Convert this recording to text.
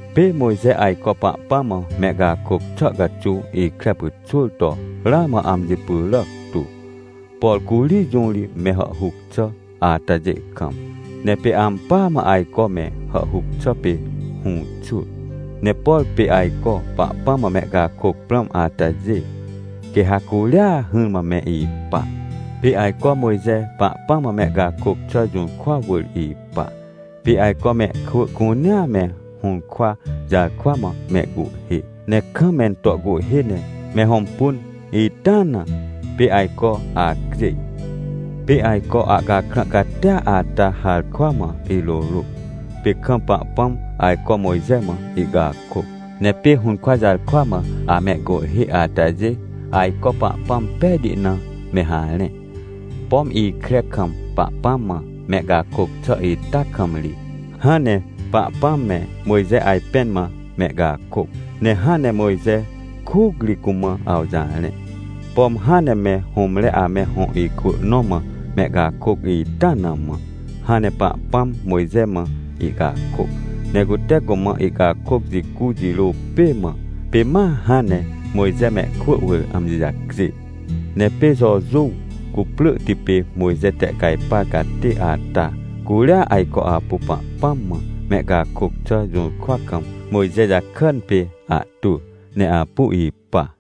Pê Mojxe ajco Pahpãm mã mehcakôc xà caxuw ikre pyxwỳr toramã amji pyràc tu, por curi jũ ri me hàhhuc xà atajê kam. Ne pê ampỳa mã ajco me hàhhuc xà pê hũxwỳ. Ne por pê ajcoPahpãm mã mehcakôc prãm atajê, quê ha curia hỹrmãme ipa. Pê ajco MojxePahpãm mã mehcakôc xà jũrkwa wỳr ipa, pê ajco mehkwỳ cunea me hũrkwajarkwa mã mehcuhhê, ne kam mento cuhhê ne mehõmpun itaa na, pê ajco acjêj. Pê ajco ahcakrã catia ata harkwa mã irôrôc, pê kamPahpãm ajco Mojxe mã ihcakôc. Ne pê hũrkwa jarkwa mã amehcuhhêatajê ajco Pahpãm pejti na me harẽ. Pom ikre kam Pahpãm mã mehcakôc xà ita kam ri, hãn ne Pahpãm me Mojxe ajpẽn mã mehcakôc, ne hãn ne Mojxe kucri cumã awjarẽ. Pom hãn ne me hũmre ame hõ ikwỳ nõ mã mehcakôc itana mã, hãn ne Pahpãm Mojxe mã ihcakôc. Ne cute cumã ihcakôc jicujirô pê mã, pê ma hãn ne Mojxemehkwỳ wỳr amji jacjê. Ne pê Jojuw cuprỳhti pê Mojxe tehcajpar catê ata, curia ajco apuPahpãm mã mehcakôc xà jũrkwa kam Mojxe jakàn pê ahtwỳ ne apu ipa.